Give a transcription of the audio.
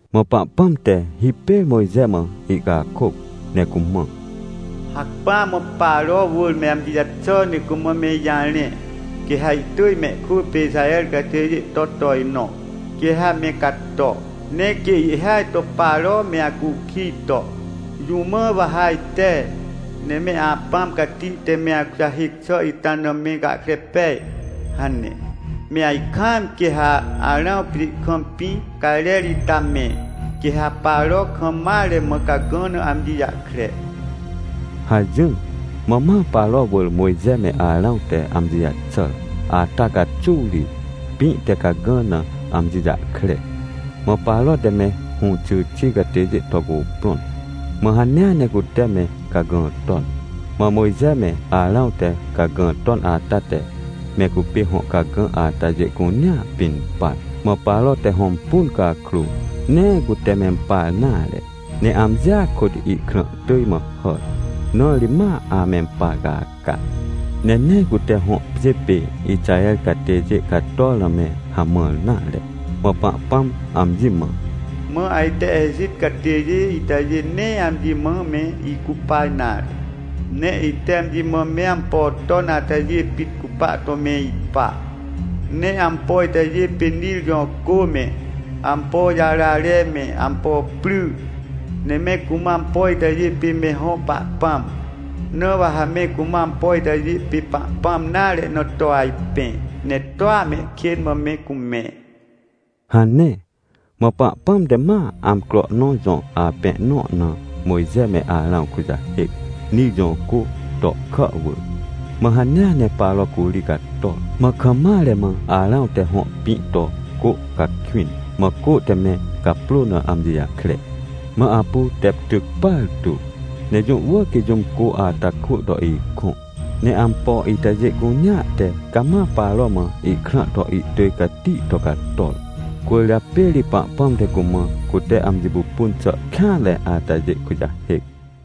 Mã Pahpãm te hipêr Mojxe mã ihcakôc ne cumã: — Hacpỹa mã Paro wỳr me amji jaxà ne cumã me ijarẽ. Quê ha ihtỳj meikwỳ pê Ixaher catêjê to tojnõ, quê ha me cato. Ne quê ihhêaj to Paro meacukij to: “Jũ mã wa ha ajte, ne me Apãm Cati te me akujahêc xàita na me gahkre pej?” hane, me ajkaam quê ha Arãw pjê kam pĩ cajrer ita mẽ, quê ha Paro kam maremã cagã na amji jahkre — hajỹr. Mã ma Paro wỳr Mojxe me Arãw te amjijaxàr ata caxuw ri, pĩ te cagã na amji jahkre. Mã Paro te me hũxyxi catêjê to cuprõn, mã hanea ne cute me cagã ton. Mã Mojxe me Arãw te cagã ton ata te me cupê hõ cagã atajê cunea pin par. Mã Paro te hõmpun cakrô, nee cutemempar nare. Ne amjia kôtihkrã tỳj mã hàr, na ri ma amempar caca. Ne nee cute hõ pjê pê, Ixaher catêjê cator na me hamãr nare. Mã Pahpãm amji mã: — Mã ajte Ejit catêjê itajê nee amji mã me icupa nare, ne ite amji mãme ampo ton atajê pit cupa to me ipa. Ne ampo itajê pê Nir jõ cô me, ampojarare me, ampo pry. Ne me cumã ampo itajê pê me hõ pahpãm. Na wa ha me cumã ampoitajê pê pahpãm nare na to ajpẽ, ne toa mehkên mã me cumẽ — hane. Mã Pahpãm te ma amcro nõ jõ apẽ nõ na Mojxe me Arãw kujahêc, Nir jõcô tohkà wỳr. Mã hanea ne Paro curi cator. Mã kam mare mãArãw te hõ pĩ to cô cakwĩn, mã cô te me caprô na amji jahkre. Mã apu tep tyc partu. Ne jũ wỳrquê jũm cô ata kwỳ to ikõ. Ne ampo itajê cunea te cama Paro mã ihkrã toihtỳj cati to cator. Cwỳrjapê ri Pahpãm te cumã cute amji pupun xàkêanre atajê kujahêc.